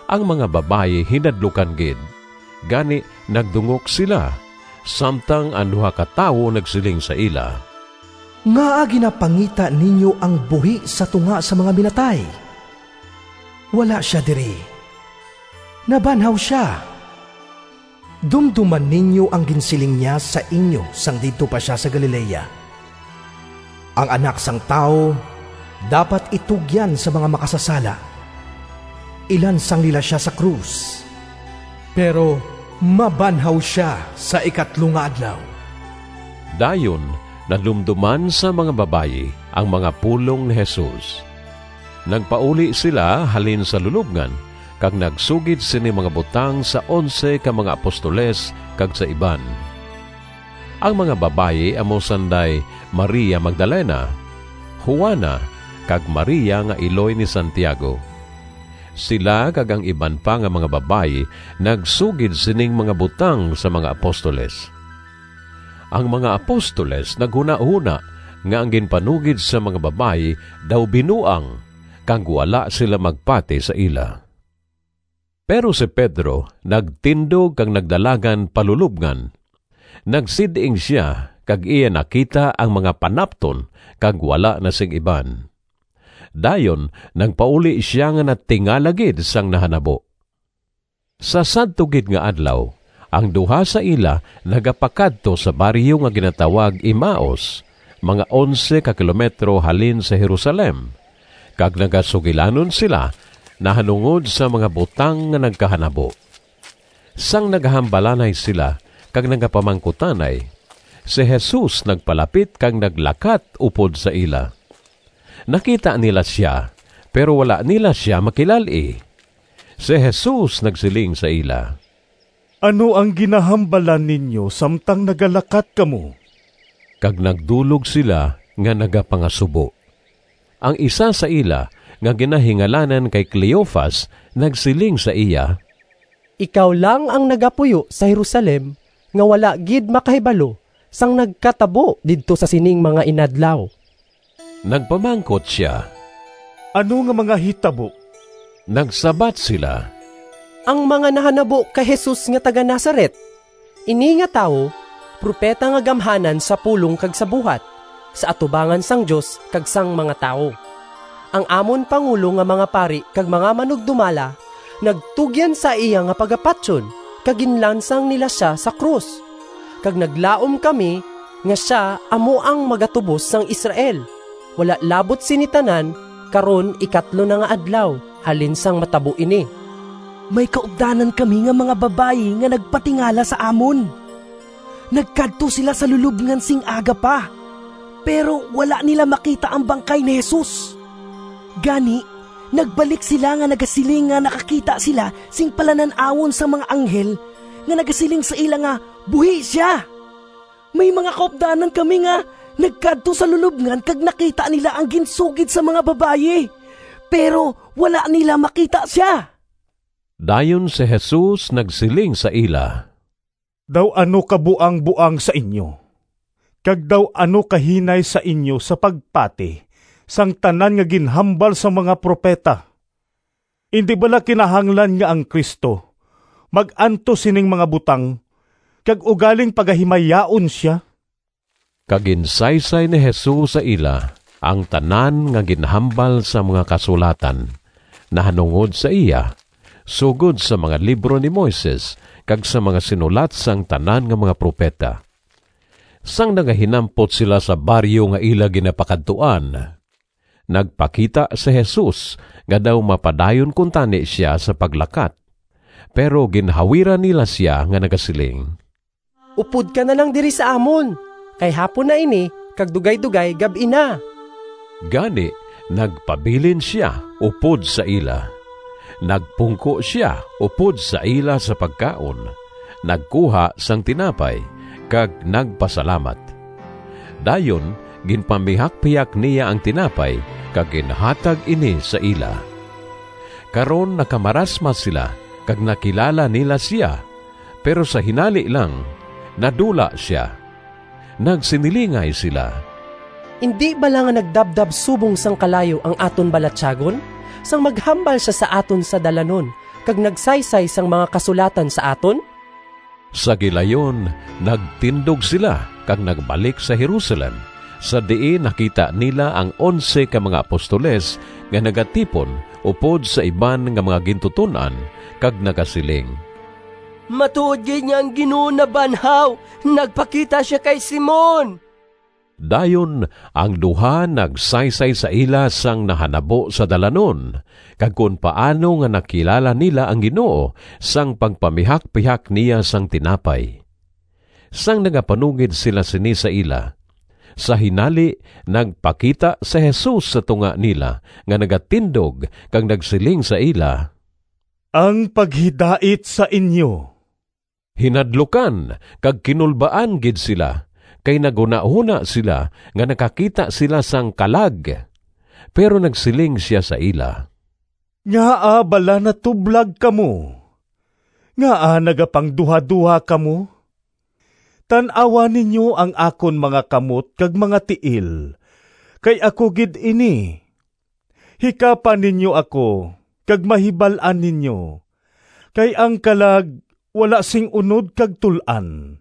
Ang mga babayi hinadlukan gid, gani nagdungok sila, samtang ang duha ka tawo nagsiling sa ila, “Ngaa ginapangita ninyo ang buhi sa tunga sang mga minatay? Wala sia diri! Nabanhaw sia! Dumdoma ninyo ang ginsiling niya sa inyo sang didto pa sia sa Galilea, ‘Ang Anak sang Tawo dapat itugyan sa mga makasasala, ilansang nila sia sa krus, pero mabanhaw sia sa ikatlo nga adlaw.’” Dayon nadumdoman sang mga babayi ang mga pulong ni Jesus. Nagpauli sila halin sa lulobngan kag nagsugid sining mga butang sa onse ka mga apostoles kag sa iban. Ang mga babayi amo sanday Maria Magdalena, Juana, kag Maria nga iloy ni Santiago. Sila kag ang iban pa nga mga babayi nagsugid sining mga butang sa mga apostoles. Ang mga apostoles naghunahona nga ang ginpanugid sang mga babayi daw binuang, kag wala sila magpati sa ila. Pero si Pedro nagtindog kag nagdalagan pa lulobngan. Nagsid-ing sia kag iya nakita ang mga panapton kag wala na sing iban. Dayon nagpauli sia nga natingala gid sang nahanabo. Sa sadto gid nga adlaw ang duha sa ila nagapakadto sa baryo nga ginatawag Emaus, mga onse ka kilometro halin sa Jerusalem, kag nagasugilanon sila nahanungod sang mga butang nga nagkahanabo. Sang nagahambalanay sila kag nagapamangkutanay, si Jesus nagpalapit kag naglakat upod sa ila. Nakita nila sia, pero wala nila sia makilal-i. Si Jesus nagsiling sa ila, “Ano ang ginahambalan ninyo samtang nagalakat kamo?” Kag nagdulog sila nga nagapangasubo. Ang isa sa ila nga ginahingalanan kay Cleofas nagsiling sa iya, “Ikaw lang ang nagapuyo sa Jerusalem nga wala gid makahibalo sang nagkatabo didto sa sining mga inadlaw.” Nagpamangkot sia, “Ano nga mga hitabo?” Nagsabat sila, “Ang mga nahanabo kay Jesus nga taga-Nazaret. Ini nga tawo propeta nga gamhanan sa pulong kag sa buhat sa atubangan sang Dios kag sang mga tawo. Ang amon pangulo nga mga pari kag mga manugdumala nagtugyan sa iya nga pagapatyon, kag ginlansang nila sia sa krus. Kag naglaom kami nga sia amo ang magatubos sang Israel. Wala labot sini tanan, karon ikatlo na nga adlaw halin sang matabo ini. May kaupdanan kami nga mga babayi nga nagpatingala sa amon. Nagkadto sila sa lulobngan sing aga pa, pero wala nila makita ang bangkay ni Jesus. Gani, nagbalik sila nga nagasiling nga nakakita sila sing palanan-awon sang mga anghel nga nagasiling sa ila nga buhi sia. May mga kaupdanan kami nga nagkadto sa lulobngan kag nakita nila ang ginsugid sang mga babayi, pero wala nila makita sia.” Dayon si Jesus nagsiling sa ila, “Daw ano ka buangboang sa inyo, kag daw ano kahinay sa inyo sa pagpati sang tanan nga ginhambal sang mga propeta! Indi bala kinahanglan nga ang Cristo mag-antos sining mga butang kag ugaling pagahimayaon sia?” Kag ginsaysay ni Jesus sa ila ang tanan nga ginhambal sang mga Kasulatan nahanungod sa iya, sugod sa mga libro ni Moises kag sa mga sinulat sang tanan nga mga propeta. Sang nagahinampot sila sa baryo nga ila ginapakadtuan, nagpakita si Jesus nga daw mapadayon kuntani sia sa paglakat, pero ginhawiran nila sia nga nagasiling, “Upod ka na lang diri sa amon, kay hapon na ini kag dugaydogay gab-i na.” Gani nagpabilin sia upod sa ila. Nagpungko sia upod sa ila sa pagkaon, nagkuha sang tinapay, kag nagpasalamat. Dayon ginpamihakpihak niya ang tinapay kag ginhatag ini sa ila. Karon nakamarasmas sila kag nakilala nila sia, pero sa hinali lang nadula sia. Nagsinilingay sila, “Indi bala nga nagdabdab subong sang kalayo ang aton balatyagon sang maghambal sia sa aton sa dalanon kag nagsaysay sang mga Kasulatan sa aton?” Sa gilayon nagtindog sila kag nagbalik sa Jerusalem sa diin nakita nila ang onse ka mga apostoles nga nagatipon upod sa iban nga mga gintuton-an kag nagasiling, “Matuod gid nga ang Ginoo nabanhaw! Nagpakita sia kay Simon!” Dayon ang duha nagsaysay sa ila sang nahanabo sa dalanon, kag kon paano nga nakilala nila ang Ginoo sang pagpamihakpihak niya sang tinapay. Sang nagapanugid sila sini sa ila, sa hinali nagpakita si Jesus sa tunga nila nga nagatindog kag nagsiling sa ila, “Ang paghidait sa inyo.” Hinadlukan kag kinulbaan gid sila, kay naghunahona sila nga nakakita sila sang kalag. Pero nagsiling sia sa ila, “Ngaa bala natublag kamo? Ngaa nagapangduhadoha kamo? Tan-awa ninyo ang akon mga kamot kag mga tiil, kay ako gid ini. Hikapa ninyo ako kag mahibal-an ninyo, kay ang kalag wala sing unod kag tul-an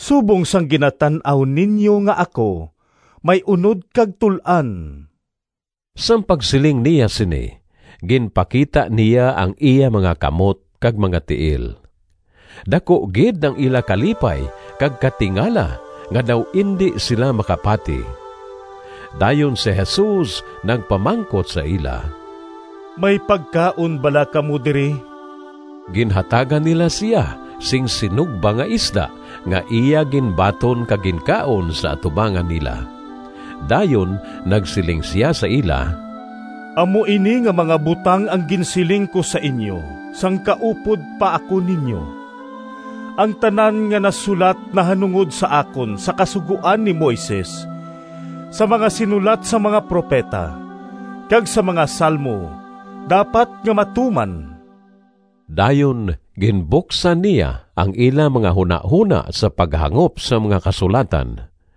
subong sang ginatan-aw ninyo nga ako may unod kag tul-an.” Sang pagsiling niya sini ginpakita niya ang iya mga kamot kag mga tiil. Daku gid ang ila kalipay kag katingala nga daw indi sila makapati. Dayon si Jesus nagpamangkot sa ila, “May pagkaon bala kamo diri?” Ginhatagan nila sia sing sinugba nga isda, nga iya ginbaton kag ginkaon sa atubangan nila. Dayon nagsiling sia sa ila, “Amo ini nga mga butang ang ginsiling ko sa inyo sang kaupod pa ako ninyo: ang tanan nga nasulat nahanungod sa akon sa Kasugoan ni Moises, sa mga sinulat sang mga propeta, kag sa mga Salmo dapat nga matuman.” Dayon gibuksan niya ang ila mga hunahona sa paghangop sang mga Kasulatan.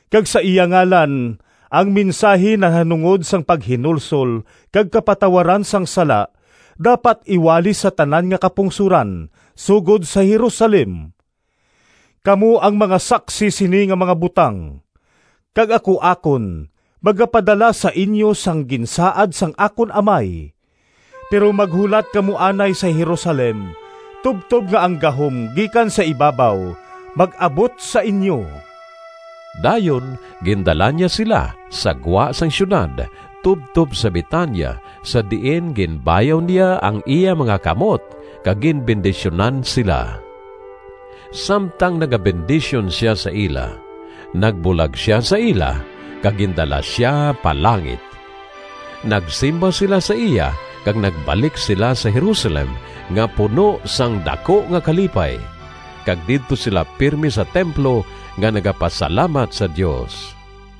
kag sa iya ngalan ang mensahi nahanungod sang paghinulsol kag kapatawaran sang sala dapat iwali sa tanan nga kapungsoran, sugod sa Jerusalem. Kamo ang mga saksi sini nga mga butang. Kag ako akon magapadala sa inyo sang ginsaad sang akon Amay. Pero maghulat kamo anay sa Jerusalem tubtob nga ang gahom gikan sa ibabaw mag-abot sa inyo.” Dayon gindala niya sila sa gwa sang siyudad tubtob sa Betania sa diin ginbayaw niya ang iya mga kamot kag ginbendisyunan sila. Samtang nagabendisyon sia sa ila, nagbulag sia sa ila kag gindala sia pa langit. Nagsimba sila sa iya kag nagbalik sila sa Jerusalem nga puno sang daku nga kalipay, kag didto sila pirme sa templo nga nagapasalamat sa Dios.